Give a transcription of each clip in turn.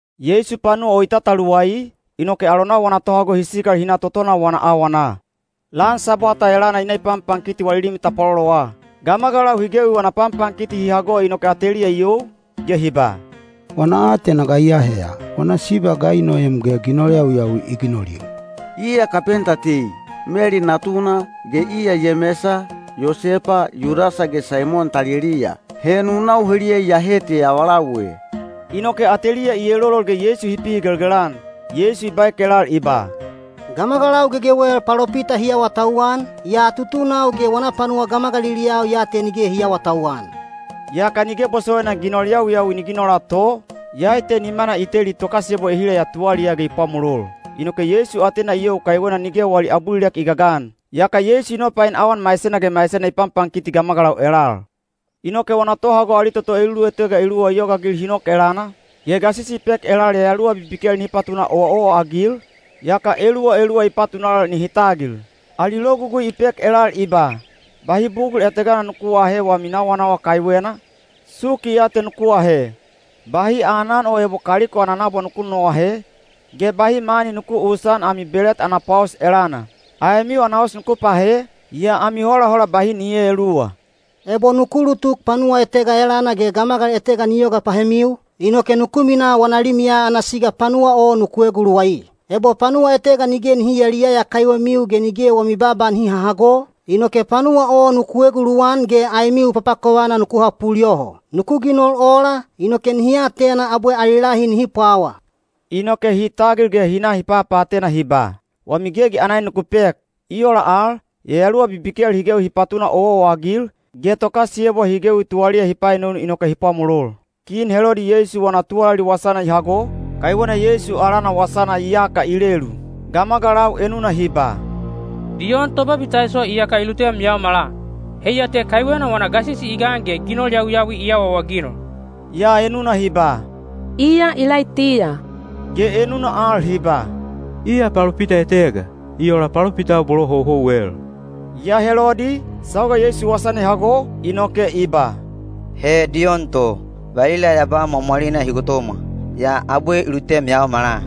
Yeisu panuwa o i tataluwai, inoke alonau wana tohago hi sikal hi na totona wana awana. Lan Sabwata elana i na i panpankiti wali limi tapwalolowa. Gamagalau hi gewi wana panpankiti hi hago inoke ateliya i you, ge hi ba, “Wana aatena ga i aheya? Wana siba ga i noem ge ginol yawiyawi i ginolil? Iya kapenta tei, Meli natuna, ge iya Yemesa, Yosepa, Yudasa ge Saimon taliliya. He nunau heliya iyahe te avalau e.” Inoke ateliya i elolol ge Yeisu hi pihigelgel-an. Yeisu i baek elal i ba, “Gamagalau gegewel palopita hi awatauwan, yaa tutunau ge wana panuwa gamagaliliyau ya te nige hi aawatauwan.” Yaka nige bosowaina ginol yawiyawi ni ginola to, iyai te nimana i teli tokasiyebwa ehila ya tuwaliyaa ge i pwamolol. Inoke Yeisu atena i you kaiwena nige wali abulilek i gagan. Yaka Yeisu i nopain awan maisena ge maisena i panpankiti gamagalau elal. Inoke wana tohago ali toto elulutega eluwa i yogaagil hi nok elana, ge gasisi i pek elal yayaluwa bibikel nihi patuna owaowa-agil, yaka eluwa eluwa i patunal nihi tagil. Ali logugui i pek elal i ba, “Bahi bugul etega nuku aahe wami nawanawa kaiwena, suki ya te nuku ahe. Bahi aanan o ebo kaliko ana nabwa nuku nonoahe, ge bahi mani nuku uusan ami belet ana pwaos elana. Aemiu ana os nuku pahe, yaa ami holahola bahi ni eeluwa. Ebo nuku ulutuk panuwa etega elana ge gamagal etega ni yoga pahemiu, inoke nuku minaa wana limiya ana siga panuwa o nuku eguluwai. Ebo panuwa etega nige nihi yayaliyaya kaiwemiu ge nige wami baaba nihi hahago, inoke panuwa o nuku eguluwan ge aemiu papakovana nuku hapul yoho. Nuku ginol ola, inoke nihi atena abwe ali lahi nihi pwawa.” Inoke hi tagil ge hi na hi papaatena hi ba, “Wami gegi ana en nuku pek.” I ola al, yayaluwa bibikel hi gewi hi patuna owaowa-agil, ge tokasiyebwa hi gewi tuwaliya hi paenonu inoke hi pwamolol. Kin Helodi Yeisu wana tuwalali wasana i hago, kaiwena Yeisu alana wasana iyaka i lelu. Gamagalau enuna hi ba, “Diyon Tobabitaiso iyaka i lutem yaomala. Heiya te kaiwena wana gasisi i gan ge ginol yawiyawi i awaawaginol.” Yaa enuna hi ba, “Iya Ilaitiya.” Ge enuna al hi ba, “Iya palopita etega, i ola palopitau bolo houhouwel.” Yaa Helodi, sauga Yeisu wasana i hago, inoke i ba, “He Diyon to! Valila ya ba mwamwalina hi gotomwa, yaa abwe i lutem yaomala.”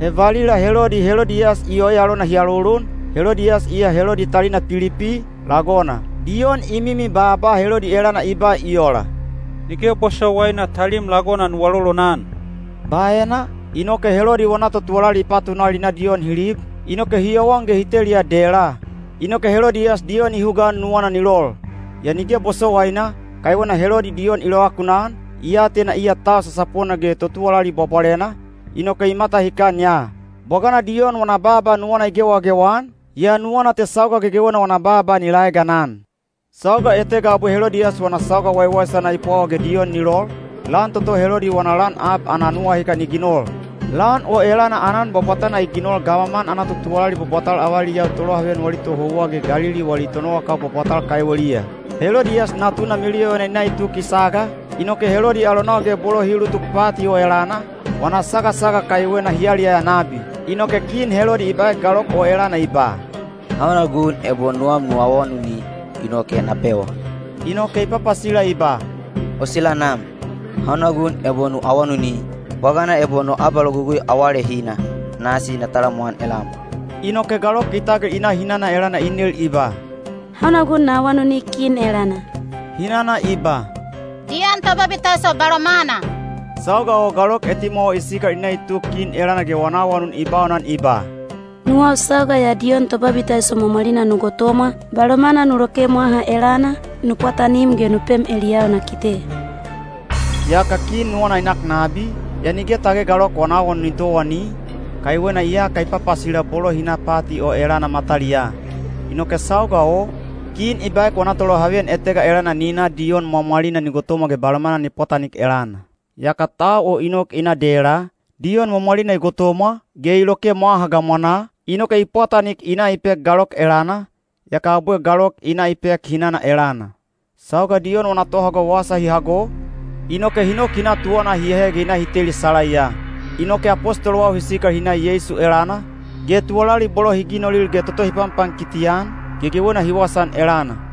He valila Helodi Helodiyas i oe alona hi alolon, Helodiyas iya Helodi talina Pilipi, lagona. Diyon i mimi baaba Helodi elana i ba i ola, “Nige bosowaina talim lagona nu alolonan.” Baena, inoke Helodi wana totuwalali i patunal hi na Diyon hi lib, inoke hi yowan ge hi teliya dela. Inoke Helodiyas Diyon i hugaan nuwana ni lol. Yaa nige i bosowaina, kaiwena Helodi Diyon i lovakunan, i atena iya tau sasapona ge totuwalali bwabwalena, inoke i matahikan ya. Bwagana Diyon wana baaba nuwana i gewagewa-an, yaa nuwana te sauga gegewena wana baaba ni laeganan. Sauga etega abwe Helodiyas wana sauga waiwaisana i pwawa ge Diyon ni lol, lan toto Helodi wana lan ab ana nuwahikan i ginol. Lan o elana aanan bwabwatana i ginol gamaman ana totuwalali bwabwatal avaliyau tolohaveyan wali tohouwa ge Galili wali tonowakau bwabwatal kaiweliya. Helodiyas natuna meluyovana i na i tuk i saga, inoke Helodi alonau ge bolo hi ulutuk pati o elana, wana sagasaga kaiwena hi yaliyaya nabi. Inoke kin Helodi i baek galok o elana i ba, “Hauna gun ebo nuwam nu awanuni, inoke na pewa.” Inoke i papasila i ba, “O sila nam, hauna gun ebo nu awanuni, bwagana ebo no abalogugui awalehina, nasi na talamwan elam.” Inoke galok i tagil i na hinana elana i nel i ba, “Hauna gun na awanuni kin elana?” Hinana i ba, “Diyon Tobabitaiso balomana.” Sauga o galok etimwawa i sikal i na i tuk kin elana ge wana awanun i baunan i ba, “Nuwau sauga ya Diyon Tobabitaiso mwamwalina nu gotomwa, balomana nu loke mwaha elana, nu pwatanim ge nu pem eliyau na kite.” Yaka kin nuwana i nak nabi, yaa nige tage galok wana awanun ni towani, kaiwena iyaka i papasila bolo hi na pati o elana mataliyaa. Inoke sauga o, kin i baek wana tolohaveyan etega elana ni na Diyon mwamwalina ni gotomwa ge balomana ni pwatanik elana. Yaka tau o i nok i na dela, Diyon mwamwalina i gotomwa, ge i loke mwaha gamwanaa, inoke i pwatanik i na i pek galok elana, yaka abwe galok i na i pek hinana elana. Sauga Diyon wana tohago wasa hi hago, inoke hi nok hi na tuwana hi ahe ge hi na hi teli salaiya. Inoke apostolowau hi sikal hi na Yeisu elana, ge tuwalali bolo hi ginolil ge toto hi panpankiti-an, gegewena hi wasaan elana.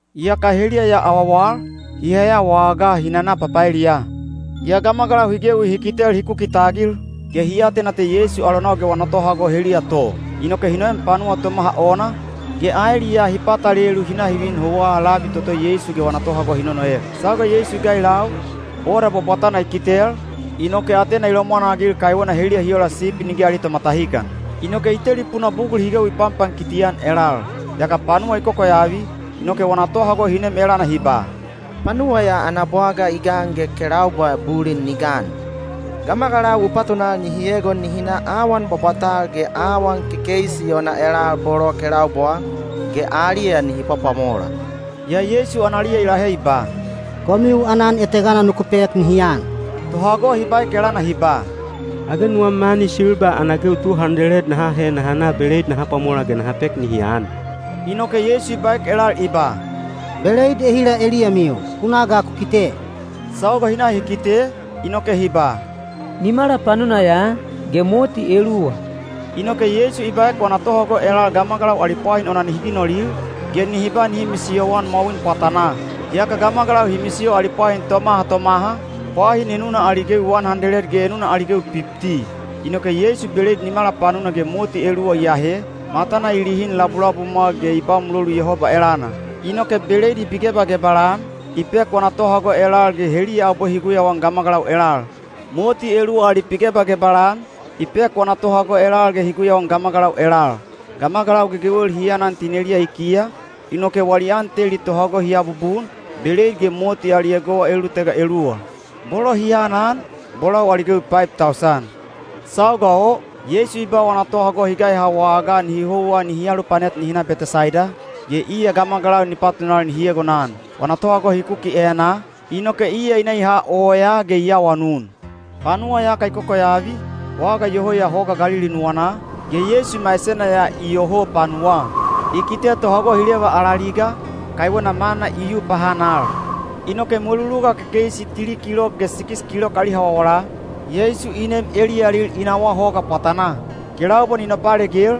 Yaka heliya ya awawal, hi heya wagaa hi nana papaeliya. Yaa gamagalau hi gewi hi kitel hi kuki tagil, ge hi atena te Yeisu alonau ge wana tohago heliya to. Inoke hi noem panuwa tomaha ona, ge aeliyaa hi patalelu hi na hi vin houwa labi toto Yeisu ge wana tohago hi nonoek. Sauga Yeisu i gailau, boda bwabwatana i kitel, inoke atena i lomwanagil kaiwena heliya hi ola sipi nige ali tomatahikan. Inoke i telipuna bugul hi gewi i panpankiti-an elal. Yaka panuwa i kokoyavi, inoke wana tohago hi nem elana hi ba, “Panuwa ya ana bwaga i gan ge kelaubwa bulin ni gan. Gamagalau u patunal nihi egon nihi na awan bwabwatal ge awan kekeisi ona elal bolo kelaubwaa, ge aliya nihi pwapwamola.” Yaa Yeisu analiya i lahe i ba, “Komiu aanan etegana nuku pek nihi an.” Tohago hi baek elana hi ba, “Age nuwam mani silba ana gewi tu handeled naha ahe naha na beleid naha pwamola ge naha pek nihi an?” Inoke Yeisu i baek elal i ba, “Beleid ehila eliyamiu? Ku na ga ku kite.” Sauga hi na hi kite, inoke hi ba, “Nimala panuna ya, ge moti eluwa.” Inoke Yeisu i baek wana tohago elal gamagalau ali pwahin ona nihi ginolil, ge nihi ba nihi misiyoan mwawin pwatanaa. Yaka gamagalau hi misiyo ali pwahin tomaha tomaha, pwahin enuna ali gewi wan handeled ge enuna ali gewi pipti. Inoke Yeisu beleid nimala panuna ge moti eluwa i ahe, matana i lihin labulabumwa ge i ba mulolu Yehoba elana. Inoke beleid i pigebagebal-an, i pek wana tohago elal ge heliya abwe hi guyauan gamagalau elal. Moti eluwa al i pigebagebal-an, i pek wana tohago elal ge hi guyauan gamagalau elal. Gamagalau gegewel hi anan tineliya i kiya, inoke wali an teli tohago hi abubun, beleid ge moti ali egowa elulutega eluwa. Bolo hi anan, bolau ali gewi paib tausan. Sauga o, Yeisu i ba wana tohago hi gaiha wagaa nihi houwa nihi alupanet nihi na Betesaida, ge iya gamagalau ni patunal nihi egonan. Wana tohago hi kuki enaa, inoke iya i na i ha oyaa ge i awanun. Panuwa iyaka i kokoyavi, waga iyoho ya hoga Galili nuwanaa, ge Yeisu maisena ya iyoho panuwaa. I kite tohago hi leva alaliga, kaiwena mana i yu pahanal. Inoke mweluluga kekeisi tili kilok ge sikis kilok ali hawawala, Yeisu i nem eliyalil i nawaa hoga pwatanaa. Kelaubwa ni nopalegel,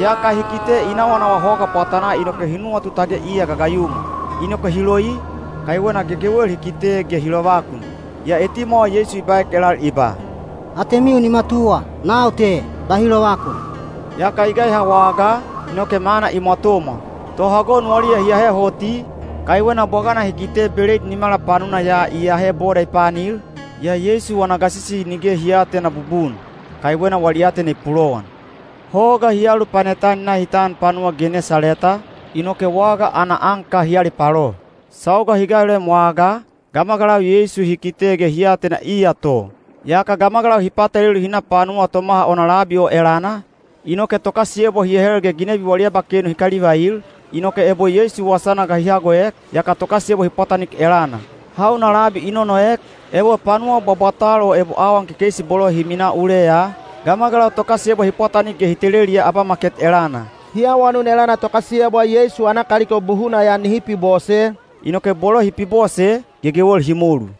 yaka hi kite i nawanawa hoga pwatanaa inoke hi nuwatu tage iya gagayumwa. Inoke hi loi, kaiwena gegewel hi kite ge hi lovakun. Yaa etimwawa Yeisu i baek elal i ba, “Atemiu ni matuwa! Nau te. Bahi lovakun!” Yaka i gaiha wagaa, inoke mana i mwatomwa. Tohago nuwaliya hi ahe hoti, kaiwena bwagana hi kite beleid nimala panuna ya i ahe boda i paanil, yaa Yeisu wana gasisi nige hi aatena bubun, kaiwena wali aatena i pulowan. Hoga hi alupanet-an hi na hi tan panuwa Genesaleta, inoke waga ana anka hi alipalo. Sauga hi gailoem wagaa, gamagalau Yeisu hi kite ge hi atena iya to. Yaka gamagalau hi patalelu hi na panuwa tomaha ona labi o elana, inoke tokasiyebwa hi ahel ge ginebi wali abakenu hi kalivail, inoke ebo Yeisu wasana ga hi hagoek, yaka tokasiyebwa hi pwatanik elana. Hauna labi i nonoek, ebo panuwa bwabwatal o ebo awan kekeisi bolo hi minaa uleya, gamagalau tokasiyebwa hi pwatanik ge hi teleliya abamaket elana. Hi awanun elana tokasiyebwa Yeisu ana kaliko buhuna ya nihi pibose, inoke bolo hi pibose, gegewel hi molu.